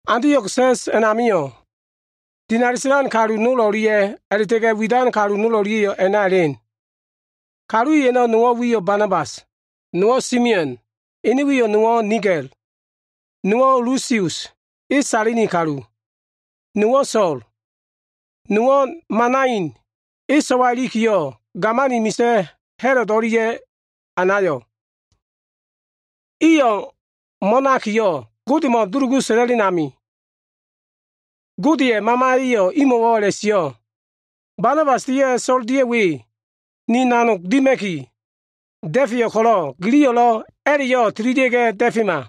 Antio꞉g sa꞉s a꞉namio꞉, dinali sa꞉lan kalu nol o꞉lia꞉ a꞉la꞉ta꞉ga꞉ widan kalu nol o꞉lia꞉yo꞉ a꞉na elen. Kalu i a꞉no꞉ nowo꞉ wiyo꞉ Banabas, nowo꞉ Simeon ene wiyo꞉ nowo꞉ Nigal, nowo꞉ Lusius e Sailini kalu, nowo꞉ So꞉l, nowo꞉ Manain, e so꞉wa o꞉ilikiyo꞉, gamani misa꞉ Ha꞉lod o꞉lia꞉ anayo꞉. Iyo꞉ ma꞉no꞉lo꞉ mo꞉nakiyo꞉ Godemo꞉ dulugu sa꞉la꞉len amio꞉, Godeya꞉ Mamaya꞉yo꞉ imo꞉wo꞉ a꞉la꞉sio꞉, “Banabas dia꞉ So꞉l dia꞉ we, ni nanogo꞉ dima꞉ki da꞉feyo꞉ ko꞉lo꞉, giliyo꞉lo꞉ a꞉la꞉yo꞉ tililia꞉ga꞉ da꞉fema.”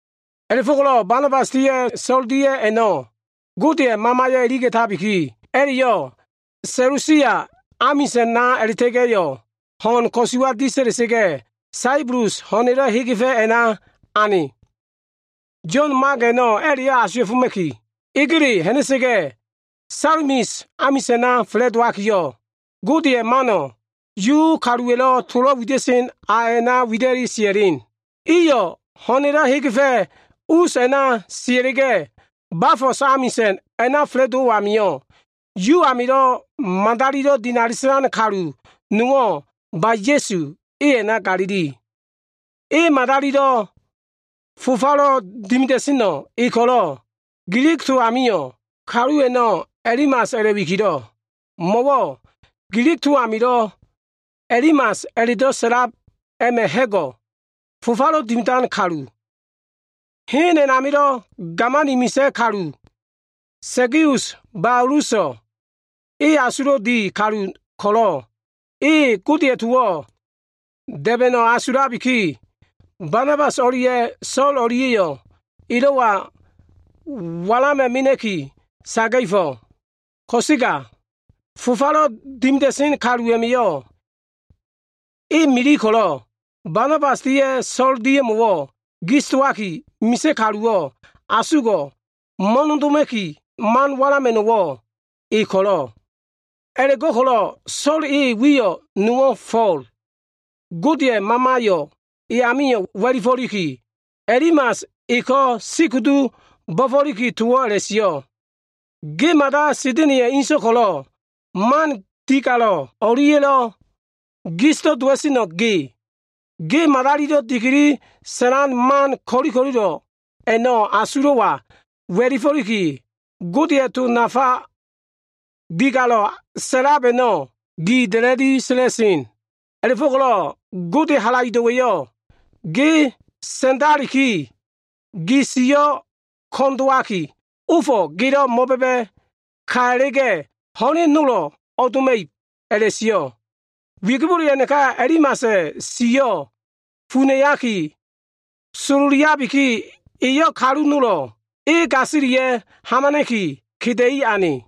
A꞉la꞉fo꞉ko꞉lo꞉ Banabas dia꞉ So꞉l dia꞉yo꞉, Godeya꞉ Mamaya꞉ iliga꞉tabiki, a꞉la꞉yo꞉ Selusia amisa꞉na a꞉la꞉ta꞉ga꞉yo꞉ ho꞉n ko꞉suwa disa꞉la꞉sa꞉ga꞉, Saibulus ho꞉na꞉lo꞉ hegefa꞉ hen a꞉na ane. Yo꞉n Mak a꞉no꞉ a꞉la꞉yo꞉ asuwa꞉foma꞉ki, egele ha꞉na꞉sa꞉ga꞉, Salamis amisa꞉na fa꞉la꞉dowakiyo꞉, Godeya꞉ mano꞉ Yu kaluwa꞉lo꞉ tolo꞉ wida꞉sen a a꞉na wida꞉li sia꞉len. Iyo꞉ hen ho꞉na꞉lo꞉ hegefa꞉ us a꞉na sia꞉la꞉ga꞉, Bafos amisa꞉n a꞉na fa꞉la꞉dowo꞉ amio꞉, Yu amilo꞉ madalilo꞉ dinali sa꞉lan kalu nowo꞉ Ba-Ya꞉su e a꞉na galili. Madalilo꞉ fofalo꞉ dimida꞉sen kaluwo꞉ e ko꞉lo꞉, Gilig to amio꞉, kalu a꞉no꞉ Elimas a꞉la꞉wikilo꞉, mo꞉wo꞉ Gilig to amilo꞉ Elimas a꞉la꞉do꞉ sa꞉lab a꞉ma꞉ ha꞉go꞉ we, fofalo꞉ dimidan kalu. Hen a꞉namilo꞉ gamani misa꞉ kalu, Segius Fo꞉lus, e asulo꞉lo꞉ di kalu ko꞉lo꞉, e Godeya꞉ towo꞉ da꞉ba꞉no꞉ asulabiki, Banabas o꞉lia꞉ So꞉l o꞉lia꞉yo꞉ elo꞉wa walama꞉ mena꞉ki saga꞉fo꞉. Ko꞉sega fofalo꞉ dimida꞉sen kalu a꞉ma꞉yo꞉ e mili ko꞉lo꞉, Banabas dia꞉ So꞉l dia꞉mo꞉wo꞉ gis dowaki, misa꞉ kaluwo꞉ asugo꞉ mo꞉nodoma꞉ki, man walama꞉no꞉wo꞉ e ko꞉lo꞉. A꞉la꞉go꞉ko꞉lo꞉ So꞉l, e wiyo꞉ nowo꞉ Fo꞉l, Godeya꞉ Mamayo꞉ e amio꞉ wa꞉lifo꞉liki, Elimas eko꞉ sikudu bo꞉fo꞉likiyo꞉ towo꞉ a꞉la꞉sio꞉, “Ge mada Sa꞉da꞉na꞉ya꞉ inso꞉ ko꞉lo꞉, man digalo꞉ o꞉lia꞉lo꞉ gisdo꞉ dowa꞉seno꞉ ge. Ge madalilo꞉ dikili sa꞉lan man ko꞉li ko꞉lilo꞉ a꞉no꞉ gi asulo꞉wa wa꞉lifo꞉liki, Godeya꞉ to nafa digalo꞉lo꞉ sa꞉lab a꞉no꞉ gi da꞉la꞉li sa꞉la꞉sen. A꞉la꞉fo꞉ko꞉lo꞉ Godeya꞉ halaido꞉wa꞉yo꞉ ge sa꞉ndalikiyo꞉, gi siyo꞉ ko꞉n dowaki, ofo꞉ gelo꞉ mo꞉ba꞉ba꞉ ka a꞉la꞉ga꞉, ho꞉len nolo꞉ o꞉doma꞉ib” a꞉la꞉sio꞉. Wigibole a꞉naka, Elimasa꞉ siyo꞉ funa꞉laki sololiabiki, eyo꞉ kalu nolo꞉ e gasilia꞉ hamana꞉ki, keda꞉i ane.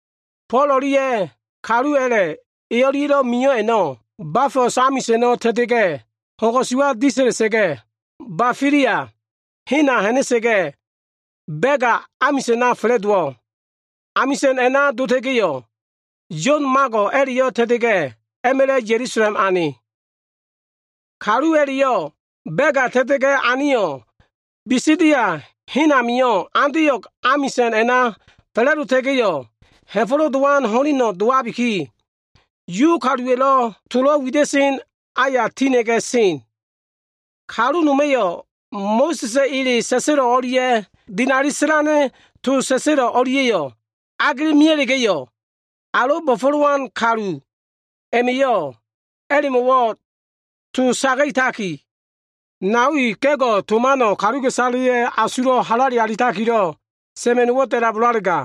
Fo꞉l o꞉lia꞉ kalu a꞉la꞉ e o꞉lia꞉lo꞉ mio꞉ a꞉no꞉, Bafos amisa꞉no꞉ ta꞉ta꞉ga꞉, ho꞉n ko꞉suwa disa꞉la꞉sa꞉ga꞉, Bafilia hena ha꞉na꞉sa꞉ga꞉, Bega amisa꞉na fa꞉la꞉dowo꞉. Amisa꞉n a꞉na dota꞉ga꞉yo꞉, Yo꞉n Mago꞉ a꞉la꞉yo꞉ ta꞉ta꞉ga꞉, a꞉ma꞉la꞉ Ya꞉lusalem ane. Kalu a꞉la꞉yo꞉ Bega a꞉na ta꞉ta꞉ga꞉ aneyo꞉, Bisidia hen amio꞉ Antio꞉g amisa꞉n a꞉na fa꞉la꞉dowa꞉sa꞉ga꞉, Ha꞉fo꞉lo꞉ Dowan ho꞉leno꞉ dowabiki, Yu kaluwa꞉lo꞉ tolo꞉ wida꞉sen aya tina꞉ga꞉ sen. Kalu noma꞉yo꞉ Mo꞉sa꞉sa꞉ ele sa꞉sa꞉lo꞉ o꞉lia꞉ dinali sa꞉lan kaluwa꞉lo꞉ to sa꞉sa꞉lo꞉ a꞉no꞉lia꞉ agela꞉sa꞉ga꞉yo꞉, alo꞉ bo꞉fo꞉lowan kalu i a꞉ma꞉yo꞉ a꞉la꞉mo꞉wo꞉ towo꞉ saga꞉taki, “Nao i, ga꞉go꞉ to mano꞉ kaluka꞉isaleya꞉ asulo꞉ halale alitakilo꞉ sa꞉ma꞉no꞉wo꞉ da꞉labolalega,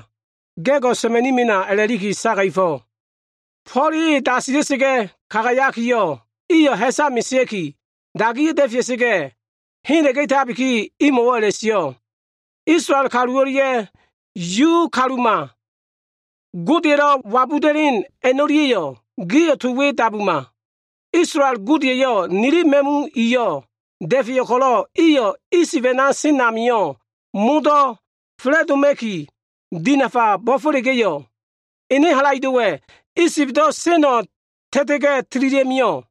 ga꞉ino꞉lo꞉ sa꞉ma꞉ni mena” a꞉la꞉liki saga꞉fo꞉. Fo꞉l e dasilia꞉sa꞉ga꞉ kagayakiyo꞉, iyo꞉ ha꞉sa mesea꞉ki dagiya꞉ da꞉fea꞉sa꞉ga꞉ hela꞉tabikiyo꞉, imo꞉wo꞉ a꞉la꞉sio꞉, “Isolael kalu o꞉lia꞉ Yu kaluma Godelo꞉ wabuda꞉len a꞉no꞉lia꞉yo꞉ gio꞉ to we dabuma! Isolaela꞉ Gode eyo꞉ nili ma꞉mu iyo꞉ da꞉feyo꞉ ko꞉lo꞉, iyo꞉ Isib a꞉na sen amio꞉ modo꞉ fa꞉la꞉doma꞉kiyo꞉ dinafa bo꞉fo꞉la꞉ga꞉yo꞉, ene halaido꞉wa꞉ Isibdo꞉ seno꞉ ta꞉ta꞉ga꞉ tililia꞉mio꞉.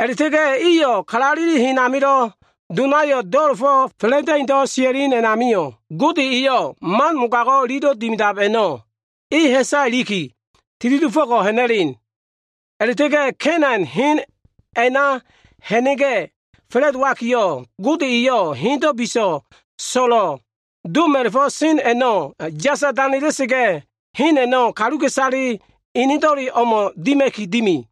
A꞉la꞉ta꞉ga꞉ iyo꞉ kalaleli hen amilo꞉ donayo꞉ do꞉la꞉fo꞉ fa꞉la꞉da꞉indo꞉ sia꞉len a꞉namio꞉, Gode eyo꞉ man mogago꞉ ililo꞉ dimida꞉lab a꞉no꞉ e ha꞉sa iliki, tili dofo꞉ ha꞉na꞉len. A꞉la꞉ta꞉ga꞉ Ka꞉ina꞉n hen a꞉na ha꞉na꞉ga꞉ fa꞉la꞉dowakiyo꞉, Gode eyo꞉ hendo꞉ biso꞉ so꞉lo꞉ doma꞉la꞉fo꞉ sen a꞉no꞉ yasa danela꞉sa꞉ga꞉, hen a꞉no꞉ kaluka꞉isale enedo꞉le o꞉mo꞉ dima꞉ki dimi.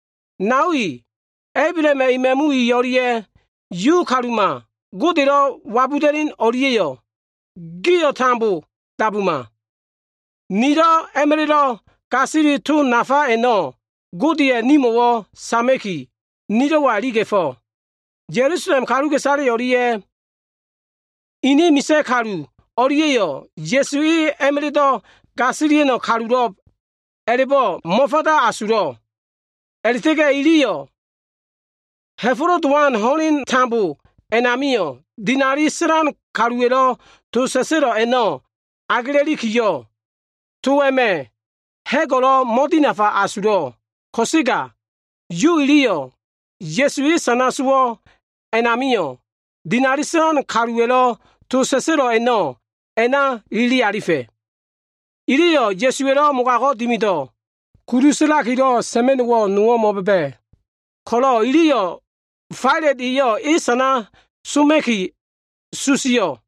“Nao i, Ablahama꞉ ema꞉mu i o꞉lia꞉ Yu kaluma Godelo꞉ wabuda꞉len o꞉lia꞉yo꞉, gio꞉ tambo dabuma. Nilo꞉ a꞉ma꞉la꞉lo꞉ gasili to nafa a꞉no꞉ Gode eyo꞉ nimo꞉wo꞉ sama꞉kiyo꞉, nilo꞉wa iliga꞉fo꞉. Ya꞉lusalem kaluka꞉isale o꞉lia꞉ ini misa꞉ kalu o꞉lia꞉yo꞉ Ya꞉su e a꞉ma꞉la꞉do꞉ gasilia꞉no꞉ kalulo꞉b a꞉la꞉bo꞉ mo꞉fanda asulo꞉. A꞉la꞉ta꞉ga꞉ iliyo꞉ Ha꞉fo꞉lo꞉ Dowan ho꞉leno꞉ tambo a꞉namio꞉, dinali sa꞉lan kaluwa꞉lo꞉ to sa꞉sa꞉lo꞉ a꞉no꞉ agela꞉likiyo꞉, to a꞉ma꞉ ha꞉go꞉lo꞉ mo꞉dinafa asulo꞉. Ko꞉sega Yu iliyo꞉ Ya꞉su e sana sowo꞉ a꞉namio꞉, dinali sa꞉lan kaluwa꞉lo꞉ to sa꞉sa꞉lo꞉ a꞉no꞉ a꞉na ilili alifa꞉. Iliyo꞉ Ya꞉suwa꞉lo꞉ mogago꞉ dimido꞉ kudu sa꞉lakilo꞉ sa꞉ma꞉no꞉wo꞉ nowo꞉ mo꞉ba꞉ba꞉ ko꞉lo꞉, iliyo꞉ Failat eyo꞉ e sana soma꞉ki susio꞉.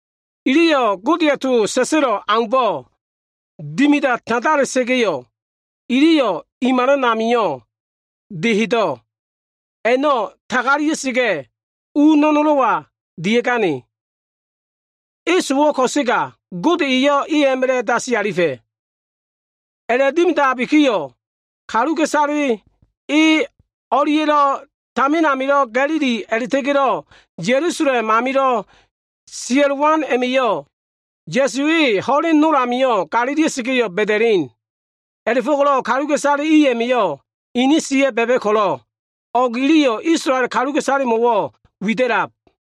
Iliyo꞉ Godeya꞉ to sa꞉sa꞉lo꞉ aumbo꞉ dimida tandala꞉sa꞉ga꞉, iliyo꞉ i malana amilo꞉ dehedo꞉ a꞉no꞉ tagalia꞉sa꞉ga꞉, u no꞉no꞉lo꞉wa dia꞉gane. E sowo꞉ ko꞉sega, Gode eyo꞉ e a꞉ma꞉la꞉ dasi alifa꞉. A꞉la꞉dimidabikiyo꞉, kaluka꞉isale e o꞉lia꞉lo꞉ tamin amilo꞉ Ga꞉lili a꞉la꞉ta꞉ga꞉lo꞉ Ya꞉lusalem amilo꞉ sia꞉lowan a꞉ma꞉yo꞉, Ya꞉su e ho꞉len nol amio꞉ galilia꞉sa꞉ga꞉yo꞉ ba꞉da꞉len. A꞉la꞉fo꞉ko꞉lo꞉ kaluka꞉isale i a꞉ma꞉yo꞉ inin siya꞉yo꞉ ba꞉ba꞉ ko꞉lo꞉, o꞉go꞉ iliyo꞉ Isolael kaluka꞉isalemo꞉wo꞉ wida꞉lab.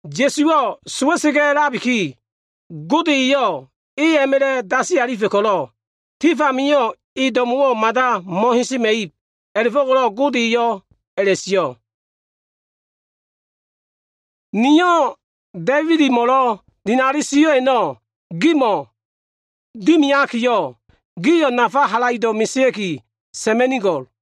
Ya꞉suwo꞉ sowa꞉sa꞉ga꞉ a꞉labiki, Gode eyo꞉ e a꞉ma꞉la꞉ dasi alifa꞉ ko꞉lo꞉, tif amio꞉ e do꞉mo꞉wo꞉ mada mo꞉hesema꞉ib. A꞉la꞉fo꞉ko꞉lo꞉ Gode eyo꞉ a꞉la꞉sio꞉, ‘Niyo꞉ Da꞉ibidmo꞉lo꞉ dinali sio꞉ a꞉no꞉ gimo꞉ dimiakiyo꞉, gio꞉ nafa halaido꞉ mesea꞉ki sa꞉ma꞉nigo꞉l.’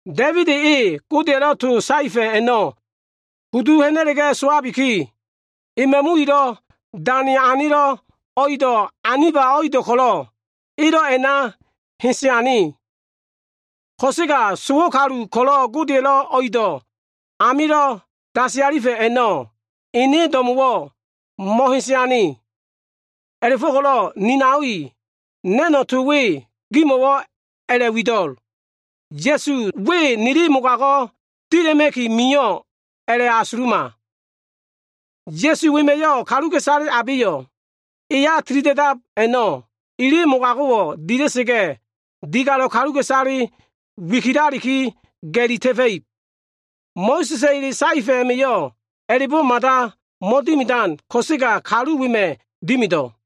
“Da꞉ibid e Godeya꞉lo꞉ to saefa꞉ a꞉no꞉ kudu ha꞉na꞉la꞉ga꞉ sowabiki, e ma꞉mu ilo꞉ dane anelo꞉ o꞉ido꞉ aniba o꞉ido꞉ ko꞉lo꞉ elo꞉ a꞉na hese ane. Ko꞉sega sowo꞉ kalu ko꞉lo꞉ Godeya꞉lo꞉ o꞉ido꞉ amilo꞉ dasi alifa꞉ a꞉no꞉ ene do꞉mo꞉wo꞉ mo꞉hese ane. “A꞉la꞉fo꞉ko꞉lo꞉ ni nao i, na꞉no꞉ to we gimo꞉wo꞉ a꞉la꞉wido꞉l. Ya꞉su we nili mogago꞉ dila꞉ma꞉niki mio꞉ a꞉la꞉asuluma. Ya꞉su wema꞉yo꞉ kaluka꞉isale abeyo꞉ e amilo꞉ tilida꞉dab a꞉no꞉, ili mogago꞉wo꞉ dila꞉sa꞉ga꞉, digalo꞉ kaluka꞉isale wikilaki ga꞉li ta꞉fa꞉ib. Mo꞉sa꞉sa꞉ ele saefa꞉ a꞉ma꞉yo꞉ a꞉la꞉bo꞉ mada mo꞉dimidan ko꞉sega kalu wema꞉ dimido꞉.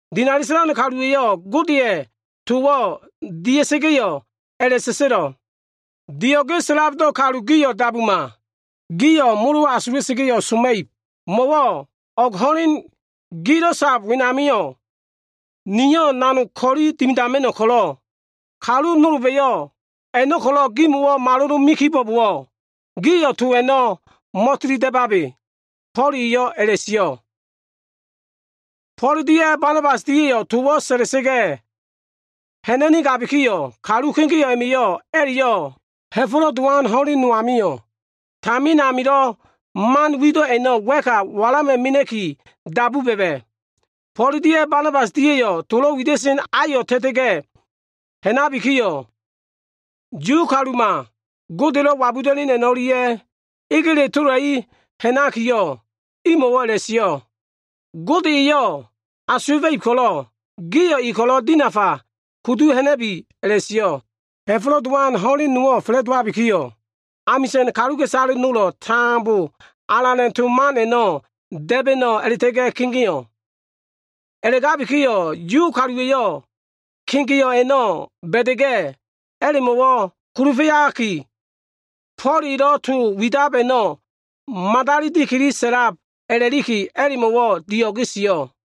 Dinali sa꞉lan kaluwa꞉yo꞉ Godeya꞉ towo꞉ dia꞉sa꞉ga꞉yo꞉ a꞉la꞉sa꞉sa꞉lo꞉, “ ‘Dio꞉ge sa꞉labdo꞉ kalu gio꞉ dabuma! Gio꞉ molo asula꞉sa꞉ga꞉yo꞉ soma꞉ib. Mo꞉wo꞉ o꞉g ho꞉len gilo꞉ sab wenamio꞉, niyo꞉ nanog ko꞉li nowo꞉ dimidama꞉no꞉ ko꞉lo꞉, kalu nolba꞉yo꞉ a꞉no꞉ ko꞉lo꞉ gimo꞉wo꞉ malolome kibo꞉bowo꞉, giliyo꞉ to a꞉no꞉ mo꞉tili da꞉babe.’” Fo꞉l eyo꞉ a꞉la꞉sio꞉. Fo꞉l dia꞉ Banabas dia꞉yo꞉ towo꞉ sa꞉la꞉sa꞉ga꞉ ha꞉na꞉nigabikiyo꞉, kalu kegeo꞉ a꞉ma꞉yo꞉ a꞉la꞉yo꞉ Ha꞉fo꞉lo꞉ Dowan ho꞉len no amio꞉ tamin amilo꞉ man wido꞉ a꞉no꞉ wa꞉ka walama꞉ki dabu ba꞉ba꞉. Fo꞉l dia꞉ Banabas dia꞉yo꞉ tolo꞉ wida꞉sen ayo꞉ ta꞉ta꞉ga꞉ ha꞉nakiyo꞉, Yu kaluka꞉isale o꞉lia꞉ Yu kaluma Godelo꞉ wabuda꞉len a꞉no꞉lia꞉ egele tola꞉i ha꞉nakiyo꞉, imo꞉wo꞉ a꞉la꞉sio꞉, “Gode eyo꞉ asuwa꞉fa꞉ib ko꞉lo꞉, gio꞉ E ko꞉lo꞉ dinafa kudu ha꞉na꞉bi” a꞉la꞉sio꞉. Ha꞉fo꞉lo꞉ Dowan ho꞉len nowo꞉ fa꞉la꞉dowabikiyo꞉, amisa꞉n kaluka꞉isaleyo꞉ modo꞉ ko꞉lo꞉ Alana꞉ to man a꞉no꞉ da꞉ba꞉no꞉ a꞉la꞉ta꞉ga꞉ kegeo꞉ A꞉la꞉gabikiyo꞉, Yu kaluwa꞉yo꞉ kegeo꞉ a꞉no꞉ ba꞉da꞉ga꞉, a꞉la꞉mo꞉wo꞉ kulufa꞉yaki, Fo꞉l elo꞉ to widab a꞉no꞉ madali dikili sa꞉lab a꞉la꞉likiyo꞉, a꞉la꞉mo꞉wo꞉ dio꞉ge sio꞉.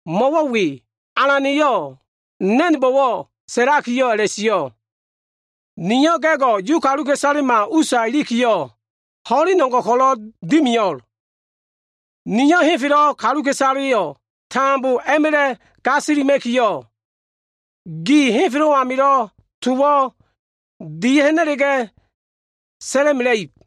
Mo꞉wo꞉ we, Alana꞉yo꞉ na꞉nbo꞉wo꞉ saetakiyo꞉ a꞉la꞉sio꞉, ‘Niyo꞉ ga꞉go꞉ Yu kaluka꞉isalema usa ilikiyo꞉, ho꞉len o꞉ngo꞉ ko꞉lo꞉ dimio꞉l. Niyo꞉ henfelo꞉ kaluka꞉isaleyo꞉ tambo a꞉ma꞉la꞉ gasilima꞉kiyo꞉, gaino꞉ henfelo꞉ amio꞉ towo꞉ dia꞉ha꞉na꞉ga꞉ sa꞉la꞉mela꞉ib.’”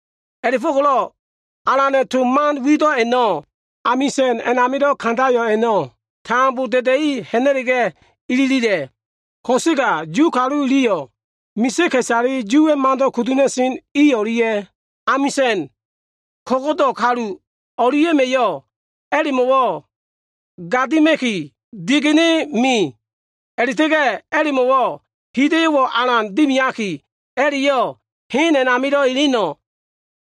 A꞉la꞉fo꞉ko꞉lo꞉ Alana꞉ to man wido꞉ a꞉no꞉ amisa꞉n a꞉namilo꞉ kandayo꞉ a꞉no꞉ tambo da꞉da꞉i ha꞉na꞉la꞉ga꞉ ililila꞉. Ko꞉sega Yu kalu iliyo꞉ misa꞉ ka꞉isale Yuwa꞉ mando꞉ kudu ha꞉na꞉sen i o꞉lia꞉, amisa꞉n ko꞉go꞉do꞉ kalu o꞉lia꞉ma꞉yo꞉ a꞉la꞉mo꞉wo꞉ gadima꞉ki, digene me. A꞉la꞉ta꞉ga꞉ a꞉la꞉mo꞉wo꞉ hida꞉yo꞉wo꞉ alan dimiaki, a꞉la꞉yo꞉ hen a꞉namilo꞉ eleno꞉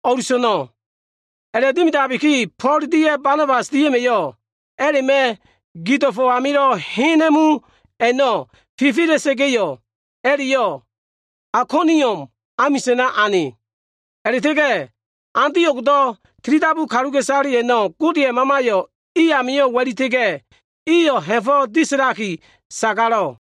o꞉luso꞉no꞉. A꞉la꞉dimidabiki, Fo꞉l dia꞉ Banabas dia꞉ma꞉yo꞉ a꞉la꞉ma꞉ gido꞉fo꞉ amilo꞉ hena꞉mu a꞉no꞉ fifi alita꞉sa꞉ga꞉yo꞉, a꞉la꞉yo꞉ Aikonium amisa꞉na ane. A꞉la꞉ta꞉ga꞉ Antio꞉gdo꞉ tilidabu kaluka꞉isale a꞉no꞉ Godeya꞉ Mamayo꞉ i amio꞉ wa꞉lita꞉ga꞉, iyo꞉ tambo ha꞉fo꞉ disa꞉laki sagalo꞉.